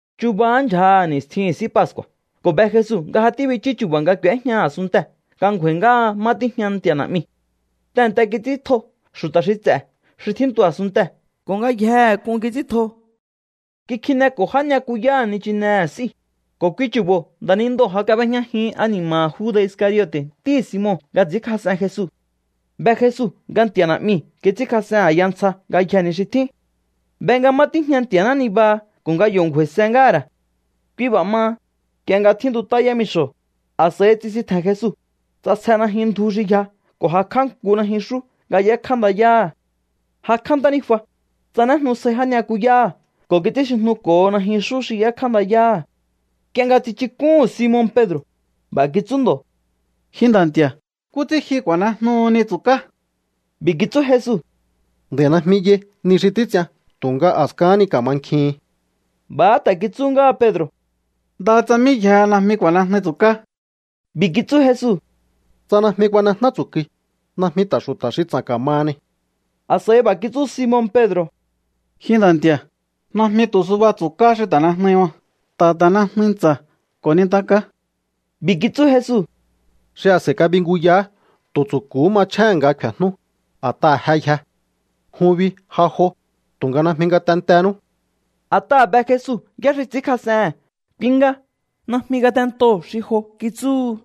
Chubahá ndyjaha̱ ni̱stjihi̱n S'í Pascu̱a̱ ko̱ be Jesu nga ja tíbichú chu̱ba̱ nga k'u̱éjña a̱sunntee̱ nga ngju̱a̱i̱ ngáha má tíjña Nti̱a̱ Na̱'miu̱. Tehe̱nte kits'íntjo xu̱ta̱ xi ts'e̱ xi tjíntu a̱sunntee̱ ko̱ ngayjehe k'un kits'íntjo. Kikjineko̱ já ni'yakuyáha̱ nichinehe̱ s'íu̱, ko̱ kui chu̱bo̱ nda̱nindoo̱ ja kab'éjñajin ani̱ma̱ha̱ Juda̱ Iscariote̱ ntíhi̱ Simon nga ts'i̱ínkjas'en Jesu. Be Jesu nga Nti̱a̱ Na̱'miu̱ kits'ínkjas'en a̱ya ntsja ngayjee̱ ni xi tjín. Be nga má tíjña Nti̱a̱ná nibaha ko̱ nga yo̱ ngju̱a̱i̱se ngáha̱ ra̱. Kui b'a̱ maha, nk'ie nga tjíntut'áha yámixo̱, a̱s'a̱i tsisintje̱n Jesu, ts'asje najyun ndju xi yja ko̱ jakj'á nku najyunxú nga y'ékjá ndayáha̱. Jakj'á ntánijua, tsanéjnu sjai já ni'yakuyáha̱ ko̱ kits'ínxijnuko̱ho najyunxú xi y'ékjá ndayáha̱. Nk'ie nga tsichuk'úhu̱n Simon Pedro̱, b'a̱ kitsú ndo̱: —Ji Nda̱ Nti̱a̱, ¿nkú ts'ín ji ku̱a̱nejnuhuni tsu̱ká? B'i̱ kitsú Jesu: —Nd'a̱i̱ najmi yai ni xi títs'ian tu̱nga a̱skahán ni ka̱mankjihin. B'a̱há ta̱ kitsú ngáha Pedro̱: —Ndaha tsa mí yjehe najmi ku̱a̱nejnui tsu̱ká. B'i̱ kitsú Jesu: —Tsa najmi kuanejná tsu̱kui, najmi ta̱ xu̱ta̱ xi ts'a̱n ka̱mahani. A̱s'a̱i b'a̱ kitsú Simon Pedro̱: —Ji Nda̱ Nti̱a̱, najmi tu̱ suba tsu̱ká xi ta̱nejnui ma. Ta̱ ta̱nejnui ntsa̱ ko̱ nintaká. B'i̱ kitsú Jesu: —Xi a̱s'a̱i kabinguyahá tu̱ tsu̱ku̱hú machjéhe̱n nga kfe̱jnú, a̱t'aha̱ je yje. Jun bi ja jo, tu̱nga najmi ngatentenú. A̱t'aha̱ be Jesu yá xi ts'i̱ínkjas'ehe̱n, kui nga: “Najmi ngatentoo̱ xi jo”, kitsúhu.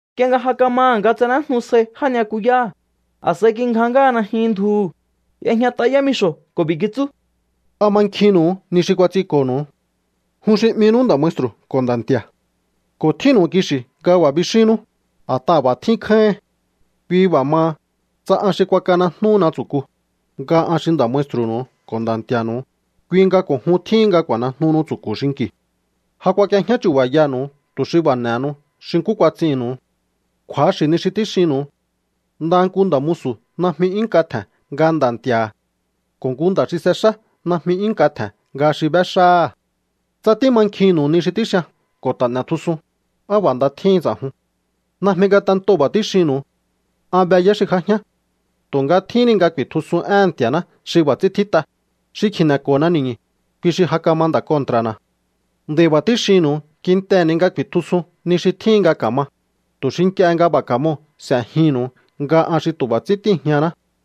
Nk'ie nga ja kamaha̱ nga tsanéjnu sjai já ni'yakuyáha̱, a̱s'a̱i kingja ngáha najyun ndjuhu̱, y'ejñat'a yámixo̱ ko̱ b'i̱ kitsú: —¿A mankjinnu̱u ni xi kuats'inko̱nu̱u? Jun xi 'minú Nda̱ Maestru̱ ko̱ Nda̱ Nti̱a̱. Ko̱ tjínnu̱u kixi̱ nga b'a̱ bixínnú, a̱t'aha̱ b'a̱ tjín kjáíhin. Kui b'a̱ maha, tsa an xi kuakanejnúhuna tsu̱ku, nga an xi Nda̱ Maestru̱nu̱u ko̱ Nda̱ Nti̱a̱nu̱u, kui nga ko̱ jun tjíhin nga ku̱a̱nejnuhunu tsu̱ku̱ xinki̱u. Ja kuak'iejñá chu̱ba̱yanu̱u tu̱ xi b'a̱ n'e̱henu xi nkú kuats'innu̱u. Kju̱axi̱ ni xi tíxinnu̱u. Ndaha nku nda̱ musu̱ najmi 'yún nk'a tje̱n nga nda̱ nti̱a̱ha̱. Ko̱ nku nda̱ xi s'exá najmi 'yún nk'a tje̱n nga xi b'éxáha̱. Tsa tímankjinnu̱u ni xi tíxian ko̱ ta̱ n'e̱tjusun, á b'a̱ nda tjíhin ts'a̱jun. ’Najmi nga tentoo̱ b'a̱ tíxinnu̱u. An be yá xi j'ajián. Tu̱nga tjíhín ni nga ku̱i̱tjusun éhe̱n Nti̱a̱ná xi b'a̱ ts'ín tjít'a: “Xi kjineko̱na ni̱ñu̱, kui xi ja kama nda̱ kontra̱na̱.” Nd'a̱i̱ b'a̱ tíxinnu̱u kintehe̱ ni nga ku̱i̱tjusun ni xi tjíhin nga ka̱ma, tu̱ xi nk'ie nga b'a̱ ka̱moo̱ s'e̱jihi̱nnu̱u nga an xi tu̱ b'a̱ ts'ín tíi̱jñaná.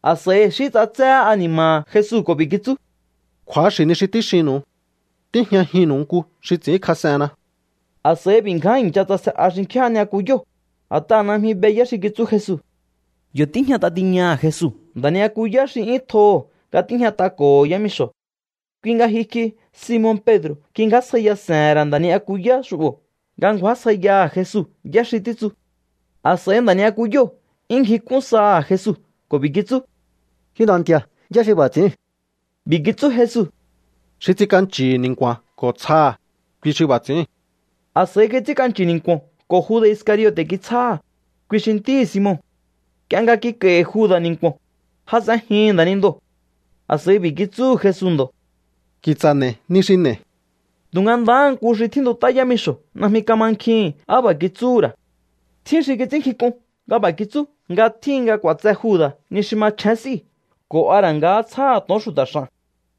A̱s'a̱i xí ts'atséhé ani̱ma̱ha̱ Jesu ko̱ b'i̱ kitsú: —Kju̱axi̱ ni xi tíxinnu̱u. Tíjñajinnu̱u nku xi ts'i̱ínkjas'enna. A̱s'a̱i b'i̱ ngján i̱ncha tsase'a xinkjín já ni'yakuyóo̱, a̱t'aha̱ najmi be yá xi títsu Jesu. Yo̱ tíjñat'a tiñaha̱ Jesu nda̱ ni'yakuyá xi 'yún tjoho̱ nga tíjñat'ako̱ho̱ yámixo̱. Kui nga jyukj'i Simon Pedro̱ kingjásjaiya se̱he̱n ra̱ nda̱ ni'yakuyá xu'bo̱ nga ngju̱ásjaiyaha̱ Jesu yá xi títsu. A̱s'a̱i nda̱ ni'yakuyóo̱ 'yún ngjik'ún saha̱ Jesu ko̱ b'i̱ kitsú: —Ji Nda̱ Nti̱a̱, ¿yá xi b'a̱ ts'i̱íu̱n? B'i̱ kitsú Jesu: —Xi ts'ink'anchi̱hi̱ ni̱nku̱a̱n ko̱ tsjaha̱, kui xi b'a̱ ts'i̱íu̱n. A̱s'a̱i kits'ínk'anchi̱ ni̱nku̱o̱n ko̱ Juda̱ Iscariote̱ kitsjáha̱, kui xi ntíhi̱ Simon. Nk'ie nga kik'a̱i̱hi̱ Juda̱ ni̱nku̱o̱n, jas'enjihi̱n nda̱nindoo̱. A̱s'a̱i b'i̱ kitsúhu̱ Jesu ndo̱: —Ki̱tsa̱ n'e̱i̱ ni xi n'e̱i̱. Tu̱nga ndahá nku xi tjíntut'á yámixo̱ najmi kamankjihi̱n á b'a̱ kitsúhu̱ ra̱. Tjín xi kits'ínnkjink'un nga b'a̱ kitsú nga tjíhin nga k'u̱a̱tse Juda̱ ni xi machjén s'íu̱ ko̱ a ra̱ nga tsjáha̱ to̱on xu̱ta̱ x'a̱n,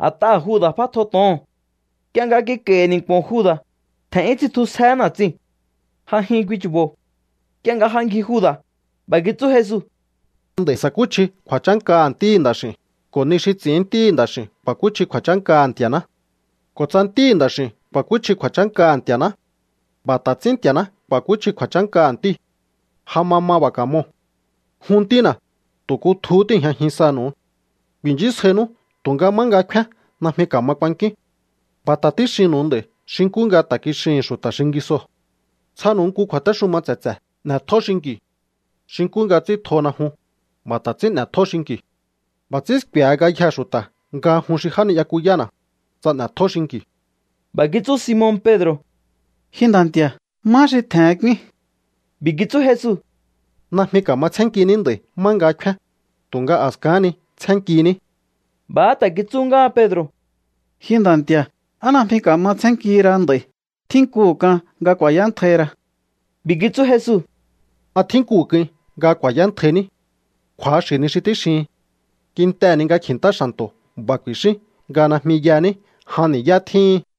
a̱t'aha̱ Juda̱ f'átjo to̱oo̱n. Nk'ie nga kik'a̱i̱hi̱ ni̱nku̱o̱n Juda̱, tje̱n'yún tsitjusjehé na̱tsiu̱n. Ja jyun kui chu̱bo̱. Nk'ie nga ja ngji Juda̱, b'a̱ kitsú Jesu: —Nd'a̱i̱ sa̱kúchji kju̱a̱chánkaha̱ Ntíhi̱ Nda̱x'i̱u̱n, ko̱ ni xi ts'i̱ín Ntíhi̱ Nda̱x'i̱u̱n ku̱a̱kúchji kju̱a̱chánkaha̱ Nti̱a̱ná. Ko̱ tsa Ntíhi̱ Nda̱x'i̱u̱n ku̱a̱kúchji kju̱a̱chánkaha̱ Nti̱a̱ná, b'a̱ ta̱ ts'ín Nti̱a̱ná ku̱a̱kúchji kju̱a̱chánkaha̱ Ntíu̱. Ja ma ma b'a̱ ka̱moo̱. Jun ntína̱, tu̱ kutjuhú tíi̱jñajin sanu̱u. Ku̱i̱nchísjainú tu̱nga má nga kfíán najmi ka̱ma kuankíún. B'a̱ ta̱ tíxinnu̱u nd'a̱i̱ xi nkú nga ta̱ kixihi̱n xu̱ta̱ xingisoo̱. ’Tsjanu̱u nku kju̱a̱téxuma tse̱tse̱: N'e̱tjó xinki̱u. Xi nkú nga ts'ín tjona jun, b'a̱ ta̱ ts'ín n'e̱tjó xinki̱u. B'a̱ ts'ín sku̱e̱he ngayjee̱ xu̱ta̱ nga jun xi já ni'yakuyána̱, tsa n'e̱tjó xinki̱u. B'a̱ kitsú Simon Pedro̱: —Ji Nda̱ Nti̱a̱, ¿má xi tje̱hen k'úín? B'i̱ kitsú Jesu: —Najmi ka̱ma tsjénnkiní nd'a̱i̱ má nga kfíán, tu̱nga a̱skahán ni tsjénnkiní. B'a̱há ta̱ kitsú ngáha Pedro̱: —Ji Nda̱ Nti̱a̱, ¿á najmi ka̱ma tsjénnkihi ra nd'a̱i̱? Tjínkuhu̱ k'an nga ku̱a̱yántjaihi ra. B'i̱ kitsú Jesu: —¿A tjínkuhu̱ k'uin nga ku̱a̱yántjaihiní? Kju̱axi̱ ni xi tíxihin. Kintehe̱ ni nga kji̱ntá xa̱nto̱ b'a̱ ku̱i̱xín nga najmi yaní jan ni̱yá tjíhin.